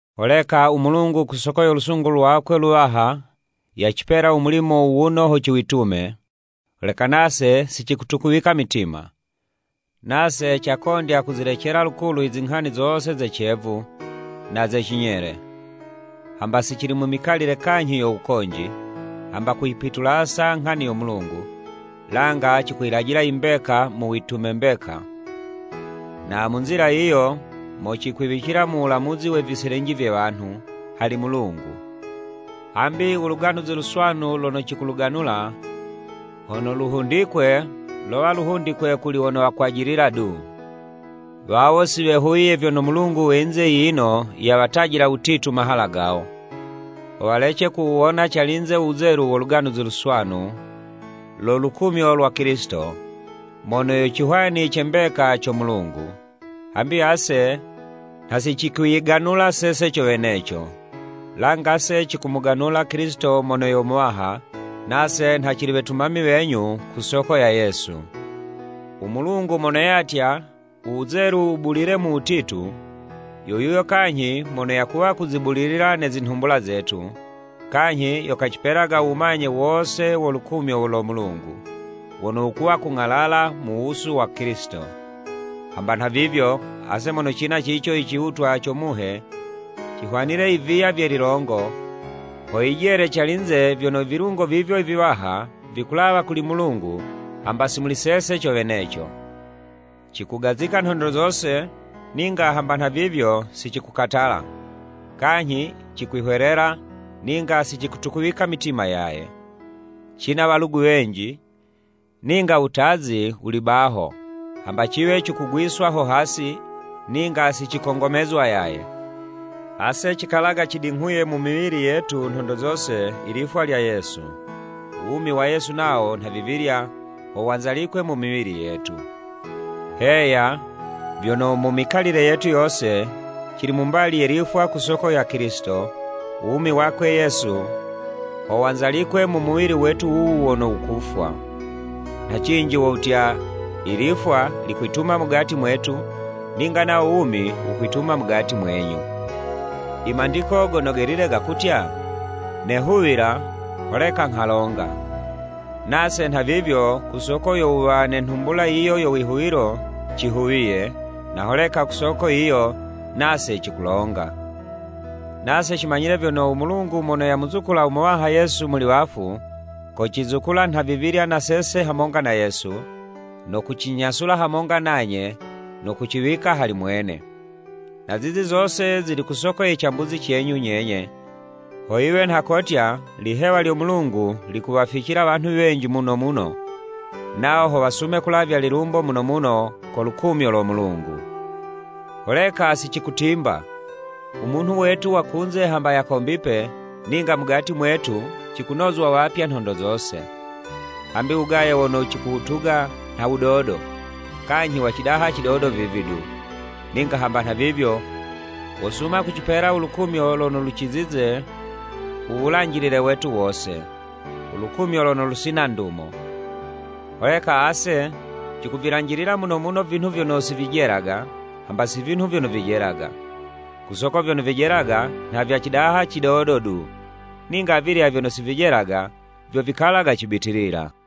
Holeka, u Mulungu ku soko yo lusungu lwakwe luwaha, yacipela u mulimo wuwuno ho ciwitume, holeka nase si cikutukuwika mitima. Nase cakondya kuzilecela lukulu i zinghani zose ze cevu, na ze cinyele. Hamba si cili mu mikalile kanyhi yo wukonji, hamba kuyipitulasa nghani yo Mulungu, langa cikuyilajila i mbeka mu witume mbeka, na mu nzila yiyo, mo cikwiwicilila mu wulamuzi we viselinji vye wanhu, hali Mulungu. Hambi u Luganuzi Luswanu lono cikuluganula, hono luhundikwe, lowa luhundikwe kuli wono wakwajilila du. Wawo si wehuwiye vyono mulungu we yinze yiyino yawatajila wutitu mahala gawo, ho walece kuwuwona calinze u wuzelu wo Luganuzi Luswanu lo lukumyo lwa Kilisito, mono yo cihwani ce mbeka co Mulungu. Hambi ase, nha si cikwiyiganula sese co weneco, langa 'se cikumuganula Kilisito mono yo Muwaha, nase nha cili wetumami wenyu ku soko ya Yesu. U Mulungu mono yatya, “Uwuzelu wubulile mu wutitu,” yo yuyo kanyhi mono yakuwa kuzibulilila ne zinhumbula zetu, kanyhi yo kacipelaga u wumanye wose wo lukumyo lo Mulungu, wono wukuwa kung'alala mu wusu wa Kilisito. Hamba nhavivyo, ase mono cina cico i ciwutwa co Muhe, cihwanile i viya vye lilongo, ho yijele calinze vyono i vilungo vivyo viwaha, vikulawa kuli Mulungu hamba si muli sese co weneco. Cikugazika nhondo zose, ninga hamba nhavivyo si cikukatala, kanyhi cikwihwelela, ninga si cikutukuwika mitima yaye, cina walugu wenji, ninga wutazi wuli baho, hamba ciwe cikugwiswa ho hasi, ninga si cikongomezwa yaye. Ase cikalaga cidinghuye mu miwili yetu nhondo zose i lifwa lya Yesu, uwumi wa Yesu nawo nhavivilya ho wanzalikwe mu miwili yetu. Heya, vyono mu mikalile yetu yose, cili mu mbali ye lifwa ku soko ya Kilisito, u wumi wakwe Yesu ho wanzalikwe mu muwili wetu wuwu wono wukufwa. Nha cinji wo wutya, i lifwa likwituma mugati mwetu, ninga nawo wumi wukwituma mugati mwenyu. I Mandiko Gono Gelile gakutya, “Nehuwila, holeka nghalonga.” Nase nhavivyo ku soko yo wuwa ne nhumbula yiyo yo wihuwilo, cihuwiye, na holeka ku soko yiyo, nase cikulonga. Nase cimanyile vyono, u Mulungu mono yamuzukula u Muwaha Yesu muli wafu, kocizukula nhavivilya na sese hamonga na Yesu, no kucinyasula hamonga nanye no kuciwika hali mwene. Na zizi zose zili ku soko ye cambuzi cenyu nyenye, ho yiwe nha kotya, lihewa lyo Mulungu, likuwaficila wanhu wenji muno muno, nawo ho wasume kulavya lilumbo muno muno ko lukumyo lo Mulungu. Holeka si cikutimba, u munhu wetu wa kunze hamba yakombipe, ninga mugati mwetu, cikunozwa wapya nhondo zose. Hambi u wugaye wono cikuwutuga nha wudodo, kanyhi wa cidaha cidodo vivi du, ninga hamba nhavivyo, wosuma kucipela u lukumyo lono lucizize u wulanjilile wetu wose, u lukumyo lono lusina ndumo. Holeka ase cikuvilanjilila muno muno vinhu vyono si vijelaga, hamba si vinhu vyono vijelaga. Ku soko vyono vijelaga, nha vya cidaha cidodo du, ninga avilya vyono si vijelaga, vyo vikalaga cibitilila.